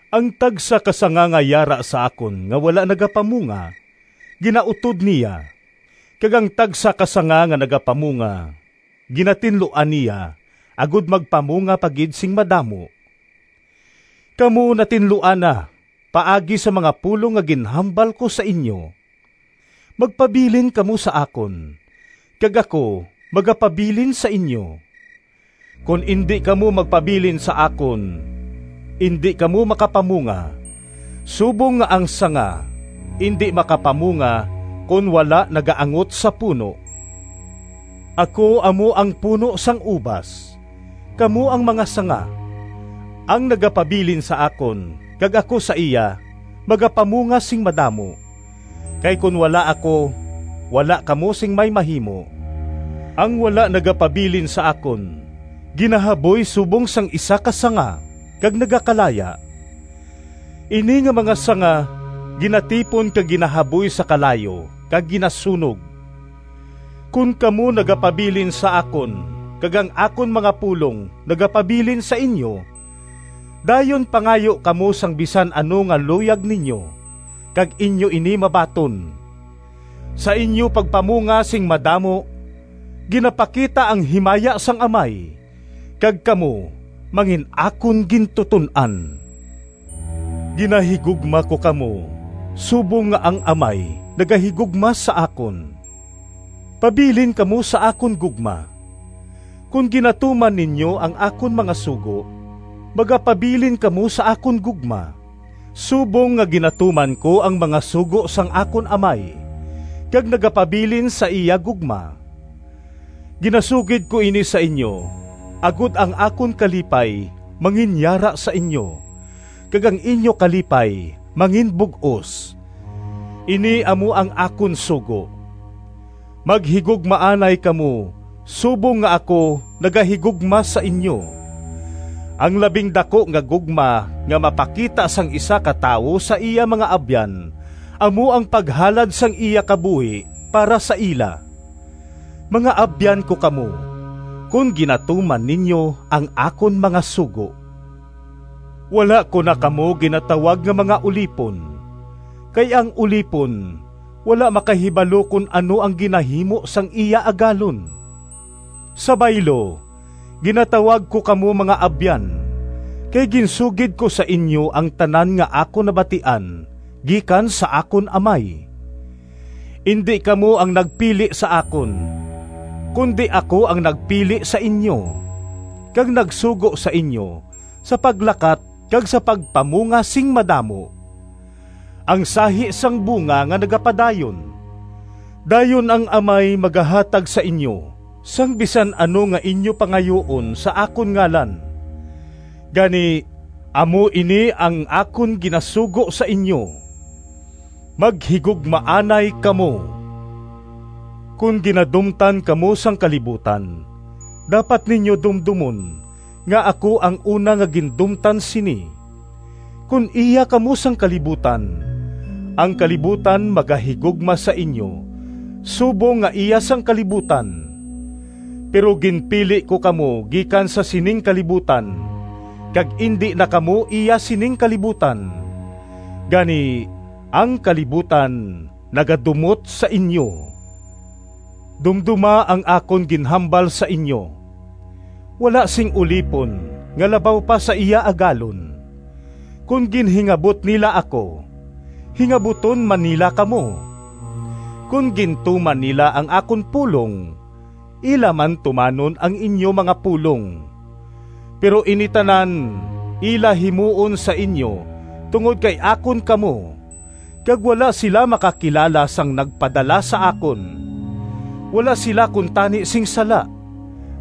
Ang tagsa ka sanga nga yara sa akon nga wala nagapamunga, ginautod niya, kag ang tagsa ka sanga nga nagapamunga, ginatinluan niya agod magpamunga pa gid sing madamo. Kamo natinluan na paagi sa mga pulong nga ginhambal ko sa inyo. Magpabilin kamo sa akon, kag ako magapabilin sa inyo. Kon indi kamo magpabilin sa akon indi kamo makapamunga, subong nga ang sanga indi makapamunga kon wala nagaangot sa puno. “Ako amo ang puno sang ubas, kamo ang mga sanga. Ang nagapabilin sa akon, kag ako sa iya, magapamunga sing madamo, kay kon wala ako wala kamo sing may mahimo. Ang wala nagapabilin sa akon ginahaboy subong sang isa ka sanga, kag nagakalaya. Ini nga mga sanga ginatipon kag ginahaboy sa kalayo kag ginasunog. Kon kamo nagapabilin sa akon kag ang akon mga pulong nagapabilin sa inyo, dayon pangayo kamo sang bisan ano nga luyag ninyo, kag inyo ini mabaton. Sa inyo pagpamunga sing madamo, ginapakita ang himaya sang Amay, kag kamo mangin-akon gintuton-an. Ginahigugma ko kamo subong nga ang Amay nagahigugma sa akon. Pabilin kamo sa akon gugma. Kon ginatuman ninyo ang akon mga sugo, magapabilin kamo sa akon gugma, subong nga ginatuman ko ang mga sugo sang akon Amay, kag nagapabilin sa iya gugma. “Ginasugid ko ini sa inyo agod ang akon kalipay manginyara sa inyo, kag ang inyo kalipay manginbug-os. Ini amo ang akon sugo: maghigugmaanay kamo subong nga ako nagahigugma sa inyo. Ang labing daku nga gugma nga mapakita sang isa ka tawo sa iya mga abyan amo ang paghalad sang iya kabuhi para sa ila. Mga abyan ko kamo, kon ginatuman ninyo ang akon mga sugo. Wala ko na kamo ginatawag nga mga ulipon, kay ang ulipon wala makahibalo kon ano ang ginahimo sang iya agalon. Sa baylo, ginatawag ko kamo mga abyan, kay ginsugid ko sa inyo ang tanan nga akon nabatian gikan sa akon Amay. Indi kamo ang nagpili sa akon, kundi ako ang nagpili sa inyo, kag nagsugo sa inyo sa paglakat kag sa pagpamunga sing madamo, ang sahi sang bunga nga nagapadayon. Dayon ang Amay magahatag sa inyo sang bisan ano nga inyo pangayuon sa akon ngalan. Gani, amo ini ang akon ginasugo sa inyo: maghigugmaanay kamo.” “Kon ginadumtan kamo sang kalibutan, dapat ninyo dumdomon nga ako ang una nga gindumtan sini. Kon iya kamo sang kalibutan, ang kalibutan magahigugma sa inyo subong nga iya sang kalibutan. Pero ginpili ko kamo gikan sa sining kalibutan kag indi na kamo iya sining kalibutan. Gani, ang kalibutan nagadumot sa inyo. Dumdoma ang akon ginhambal sa inyo: ‘Wala sing ulipon nga labaw pa sa iya agalon.’ Kon ginhingabot nila ako, hingabuton man nila kamo. Kon gintuman nila ang akon pulong, ila man tumanon ang inyo mga pulong. Pero ini tanan ila himuon sa inyo tungod kay akon kamo, kag wala sila makakilala sang nagpadala sa akon. Wala sila kuntani sing sala,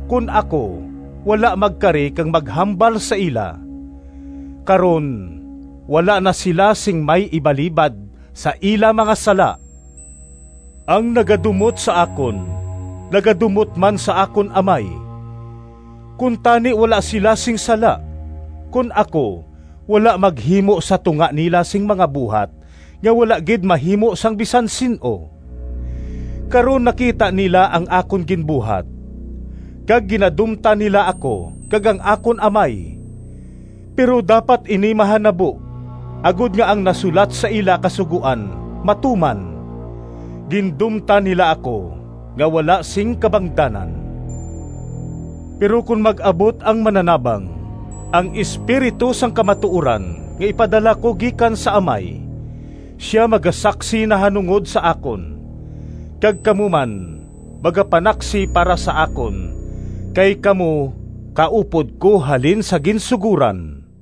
kon ako wala magkari kag maghambal sa ila. Karon wala na sila sing may ibalibad sa ila mga sala. Ang nagadumot sa akon, nagadumot man sa akon Amay. Kuntani wala sila sing sala, kon ako wala maghimo sa tunga nila sing mga buhat nga wala gid mahimo sang bisan sin-o. Karon nakita nila ang akon ginbuhat, kag ginadumtan nila ako kag ang akon Amay. Pero dapat ini mahanabo, agod nga ang nasulat sa ila Kasugoan matuman, ‘Gindumtan nila ako nga wala sing kabangdanan.’ “Pero kon mag-abot ang Mananabang, ang Espiritu sang kamatuoran nga ipadala ko gikan sa Amay, sia magasaksi nahanungod sa akon. Kag kamo man magapanaksi para sa akon kay kamo kaupod ko halin sa ginsugoran.